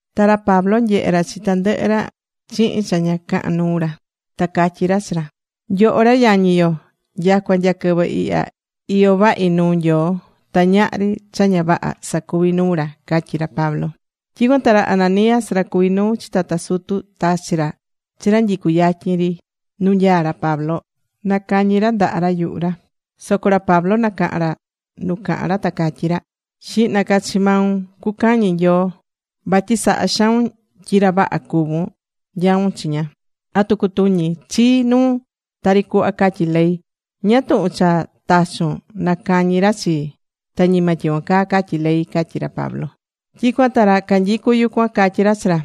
Ta ra Pablo nyehe̱ ra chi tandɨhɨ ra chihin cha ña cahan nuu ra, ta catyí ra chi ra: ―Nyoho ra yañi yo, nyacua nya quɨvɨ ihya iyó vahi nuu Nyoo ta ñahri cha ña vaha sacuví nuu ra ―catyí ra Pablo. Tyicuan ta ra Ananías ra cuví nuu chi tata sutu tachi̱ ra chi ra nyicú yatyin ri nu nyaá ra Pablo, na nacañi ra ndaha yuhu ra. Soco ra Pablo nacaha̱n ra nu cahán ra ta catyí ra: ―¡Xihna ca chi maun cucañi Nyoo, vatyi sahá xaun tyi ra vaha cuvún nyaún chiña! ¿atu cutuñi chii nuun tari cuhva catyí ley? ¿Ñáá tuhun cha tachu̱n nacañi ra chii? ta ñima tyicuan caa catyí ley ―catyí ra Pablo. Tyicuan ta ra canyicu yucuan catyí ra chi ra: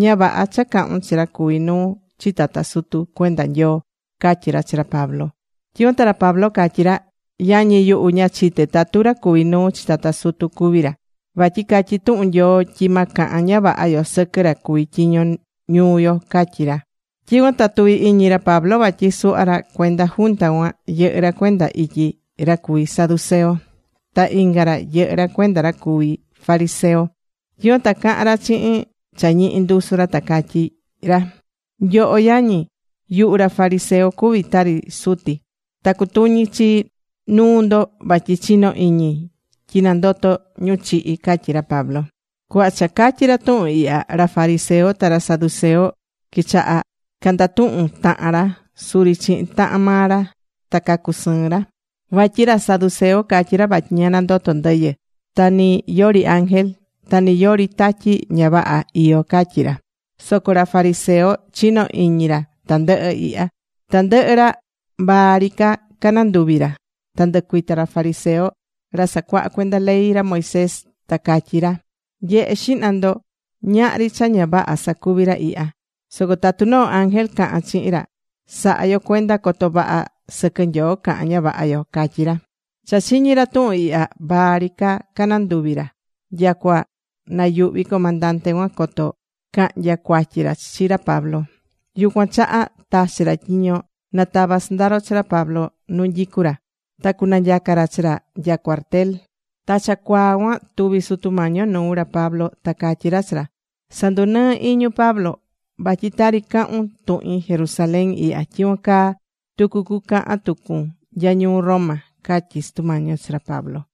―Ña vaha cha cahún chi ra cuví nuu chi tata sutu cuenda Nyoo ―catyí ra chi ra Pablo. Tyicuan ta ra Pablo catyí ra: ―Yañi yuhu, ña chite̱ tatu ra cuví nuu chi tata sutu cuví ra. Vatyi catyí tuhun Nyoo tyi ma cahan ña vaha yo sɨquɨ ra cuví tyiño ñuu yo ―catyí ra. Tyicuan ta tuvi̱ iñi ra Pablo vatyi suhva ra cuenda junta cuan, yɨhɨ́ ra cuenda ityi ra cuví saduceo. Ta inga ra yɨhɨ́ ra cuenda ra cuví fariseo. Tyicuan ta caha̱n ra chihin cha ñihi ndusu ra ta catyí ra: ―Nyoho yañi, yuhu ra fariseo cuví tari suti. Ta cutuñí chi nuu ndo vatyi chinó iñi tyi nandotó ñu chihi ―catyí ra Pablo. Cuhva cha catyi̱ ra tuhun ihya, ra fariseo ta ra saduceo, quichaha̱ candatuhun tahan ra suri chihin tahan maa ra, ta cacusɨɨ̱n ra. Vatyi ra saduceo catyí ra vatyi ña nandotó ndɨyɨ. Ta ni yori ángel ta ni yori tatyi ña vaha iyó catyí ra. Soco ra fariseo chinó iñi ra tandɨhɨ ihya. Tandɨhɨ ra vaa ri ca cananduvi̱ ra. Ta ndɨcuita̱ ra fariseo, ra sacuahá cuenda ley ra Moisés, ta catyí ra: ―Nye̱he xihna ndo, ñahri cha ña vaha sacuví ra ihya. Soco tatu noo ángel caha̱n chihin ra, sa̱ha yo cuenda coto vaha sɨquɨ Nyoo cahán ña vaha yo ―catyí ra. Cha chiñi̱ ra tuhun ihya, vaa ri ca cananduvi̱ ra. Nyacua nayuhví comandante cuan coto cahnya cuatyi ra chi ra Pablo. Yucuan chaha tachi̱ ra tyiño na tava sɨndaro chi ra Pablo nu nyicú ra, ta cunanyaca ra chi ra nya cuartel. Ta cha cuaa cuan tuvi̱ Sutu Mañi yo nuu ra Pablo ta catyí ra chi ra: ―Sa̱ndunɨɨ iñun, Pablo. Vatyi tari cahún tuhin Jerusalén ihya, tyicuan caa tucu cucahan tucun nya ñuu Roma ―catyí Sutu Mañi yo chi ra Pablo.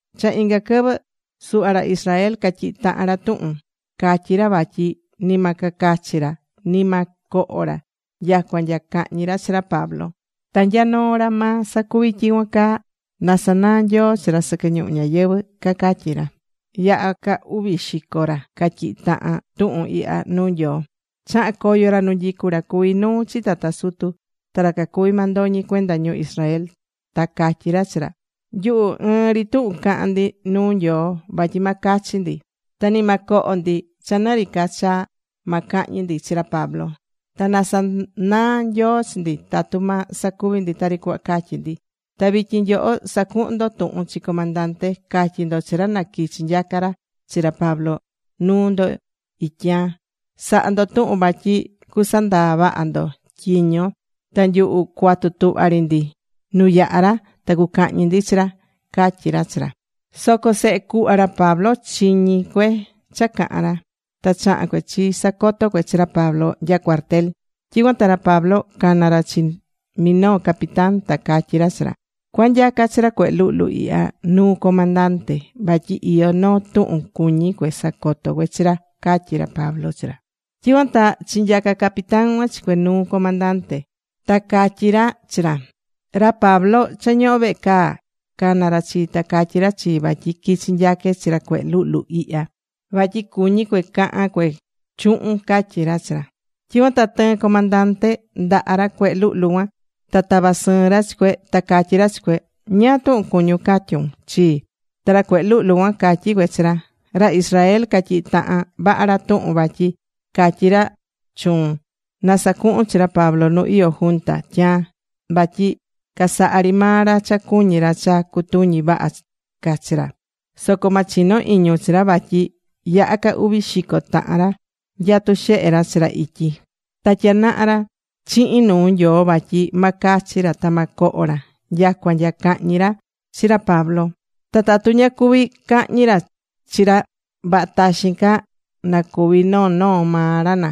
Cha inga quɨvɨ, suhva ra Israel catyihi̱ tahan ra tuhun. Catyí ra vatyi ni ma cacachi ra, ni ma coho ra nyacua nya cahñi ra chi ra Pablo. Ta nya noo ra ma sacuvi tyicuan caa na sanaa Nyoo chi ra sɨquɨ ñuhu ñáyɨvɨ, cacatyí ra. Yaha ca uvi xico ra catyihi̱ tahan tuhun ihya nuu Nyoo. Chaha̱n coyo ra nu nyicu ra cuví nuu chi tata sutu ta ra cacuví mandoñi cuenda ñu Israel. Ta catyí ra chi ra: ―Nyuhu ɨɨn ri tuhun cahan ndi nuu Nyoo vatyi ma cachi ndi ta ni ma coho ndi cha ni ri ca cha ma cahñi ndi chi ra Pablo. Ta na sanaa Nyoo chi ndi tatu ma sacuvi ndi tari cuhva catyí ndi. Ta vityin nyoho sa̱cuhun ndo tuhun chi comandante. Ca̱tyi ndo chi ra na quichi nyaca ra chi ra Pablo nuu ndo ityaan. Sa̱ha ndo tuhun vatyi cuasandaa vaha ndo tyiño, ta nyuhu cuatu tuhva ri ndi nu yahá ra ta cucahñi ndi chi ra ―catyí ra chi ra. Soco sehe cuhva ra Pablo chiñi̱ cue cha cahán ra. Ta chaha̱n cue chisacoto̱ cue chi ra Pablo nya cuartel. Tyicuan ta ra Pablo cana̱ ra chi minoo capitán. Ta catyí ra chi ra: ―Cua̱nyaca chi ra cuehe luhlu ihya nuu comandante vatyi iyó noo tuhun cuñí cue sacoto cue chi ra ―catyí ra Pablo chi ra. Tyicuan ta chinyaca̱ capitán cuan chi cue nuu comandante. Ta catyí ra chi ra: ―Ra Pablo cha ñohó vehe caa cana̱ ra chii ta catyí ra chii vatyi quichi nyaque chi ra cuehe luhlu ihya vatyi cuñí cue cahan cue chuhun ―catyí ra chi ra. Tyicuan ta tɨɨ̱n comandante ndaha ra cuehe luhlu cuan ta tava̱ sɨɨn ra chi cue ta catyí ra chi cue: ―¿Ñáá túhun cuñún catyun chii? Ta ra cuehe luhlu cuan catyí cue chi ra: ―Ra Israel catyihi̱ tahan vaha ra tuhun vatyi catyi ra chuun na sacuhun chi ra Pablo nu iyó junta tyaan. Vatyi casaha ri maa ra cha cuñí ra cha cutuñi vaha ca chi ra. Soco ma chino iñun chi ra vatyi yaha ca uvi xico tahan ra nyatú xehe chi ra ityi. Ta tyanaha ra chihin nuu Nyoo vatyi ma cachi ra ta ma coho ra nyacua nya cahñi ra chi ra Pablo. Ta tatu ña cuví cahñi ra chi ra, vaha taxín ca nacúvi noo noo maa ra na.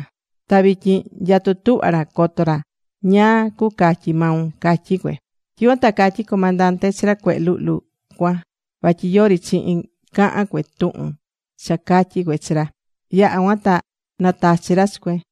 Ta vityin nyatú tuhva ra coto ra ñáá cucatyi maun ―catyí cue. Tyicuan ta catyí comandante chi ra cuehe luhlu cuan vatyi yori chihin cahán cue tuhun cha catyi̱ cue chi ra. Yaha cuan ta natachi̱ ra chi cue.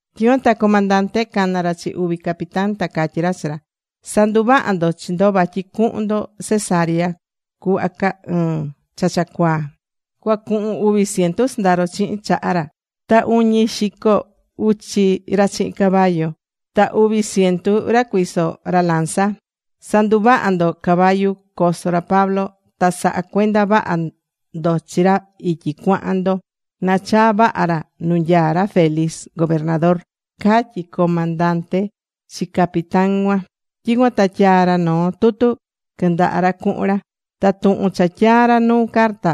Tyicuan ta comandante cana̱ ra chi uvi capitán, ta catyí ra chi ra: ―Sa̱nduvaha ndo chi ndo vatyi cuhun ndo Cesarea cuhva caa ɨɨ̱n cha cha cuaa. Cuacuhun uvi ciento sɨndaro chihin chaha ra, ta uñi xico uchi ra chihin caballo, ta uvi ciento ra cuiso ra lanza. Sa̱nduvaha ndo caballo coso ra Pablo. Ta sa̱ha cuenda vaha ndo chi ra ityi cuahan ndo na chaa vaha ra nu nyaa ra Félix gobernador ―catyí comandante chi capitán cuan. Tyicuan ta tyaa̱ ra noo tutu quɨndaha ra cuhun ra. Ta tuhun cha tyaa̱ ra nu carta,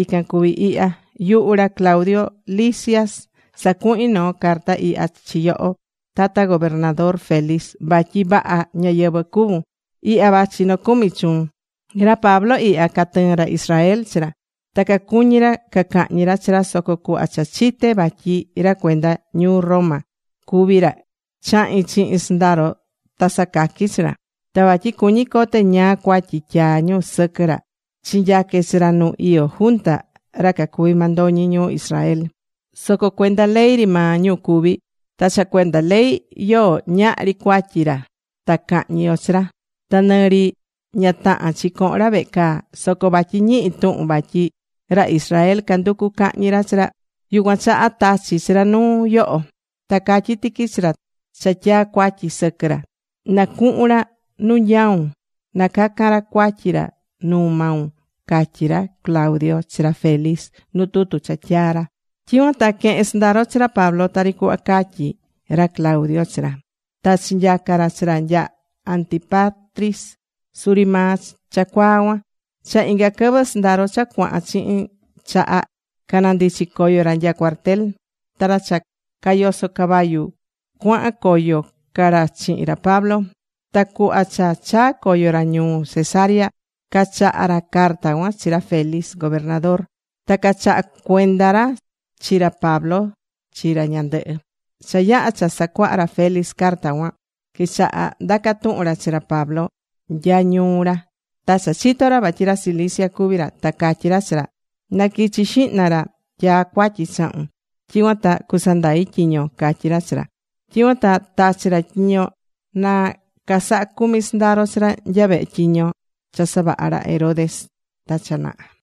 ican cuví ihya: “Yuhu ra Claudio Lisias sacuhin noo carta ihya chi yoho, tata gobernador Félix, vatyi vaha ñáyɨvɨ cuvun. Ihya vachi nocumi chuun. ’Ra Pablo ihya, catɨɨ̱n ra Israel chi ra. Ta cacuñí ra cacahñi ra chi ra. Soco cuhva cha chite̱ vatyi ra cuenda ñuu Roma cuví ra, chahi̱n chihin sɨndaro ta sacaqui̱ chi ra. Ta vatyi cuñí cote ñáá cuatyi tyaá ñu sɨquɨ ra, chinyaque̱ chi ra nu iyó junta ra cacuví mandoñi ñu Israel. Soco cuenda ley ri maa ñu cuví. Ta cha cuenda ley yoó, ñahri cuatyi ra ta cahñi yo chi ra. Ta nɨ ri ña tahán chi cohon ra vehe caa. Soco vatyi ñihi̱ tuhun vatyi ra Israel canducu cahñi ra chi ra, yucuan chaha tachí chi ra nuu yoho. Ta catyí tiqui chi ra cha tyaá cuatyi sɨquɨ ra, na cuhun ra nu nyaun na cacan ra cuatyi ra nuu maun”, catyí ra Claudio chi ra Félix nu tutu cha tyaa̱ ra. Tyicuan ta quehe̱n sɨndaro chi ra Pablo tari cuhva catyí ra Claudio chi ra, ta chinyaca̱ ra chi ra nya Antípatris suri maa cha cuaa cuan. Cha inga quɨvɨ sɨndaro cha cuahan chihin chaha, canandichi̱ coyo ra nya cuartel. Ta ra cha cayosó caballo cuahan coyo ca ra chihin ra Pablo. Ta cuhva cha chaa̱ coyo ra ñuu Cesarea, cachaha̱ ra carta cuan chi ra Félix, gobernador, ta cachaha̱ cuenda ra chi ra Pablo chi ra ñandɨhɨ. Cha yaha̱ cha sacuaha̱ ra Félix carta cuan, quichaha ndacá tuhun ra chi ra Pablo nya ñuu ra. Ta cha chito̱ ra vatyi ra Cilicia cuví ra ta catyí ra chi ra: ―Na quichi xihna ra tyaá cuatyi chahun. Tyicuan ta cusandai tyiñon ―catyí ra chi ra. Tyicuan ta tachi̱ ra tyiño na casaha cumi sɨndaro chi ra nya vehe tyiño cha savaha̱ ra Herodes ta cha naha.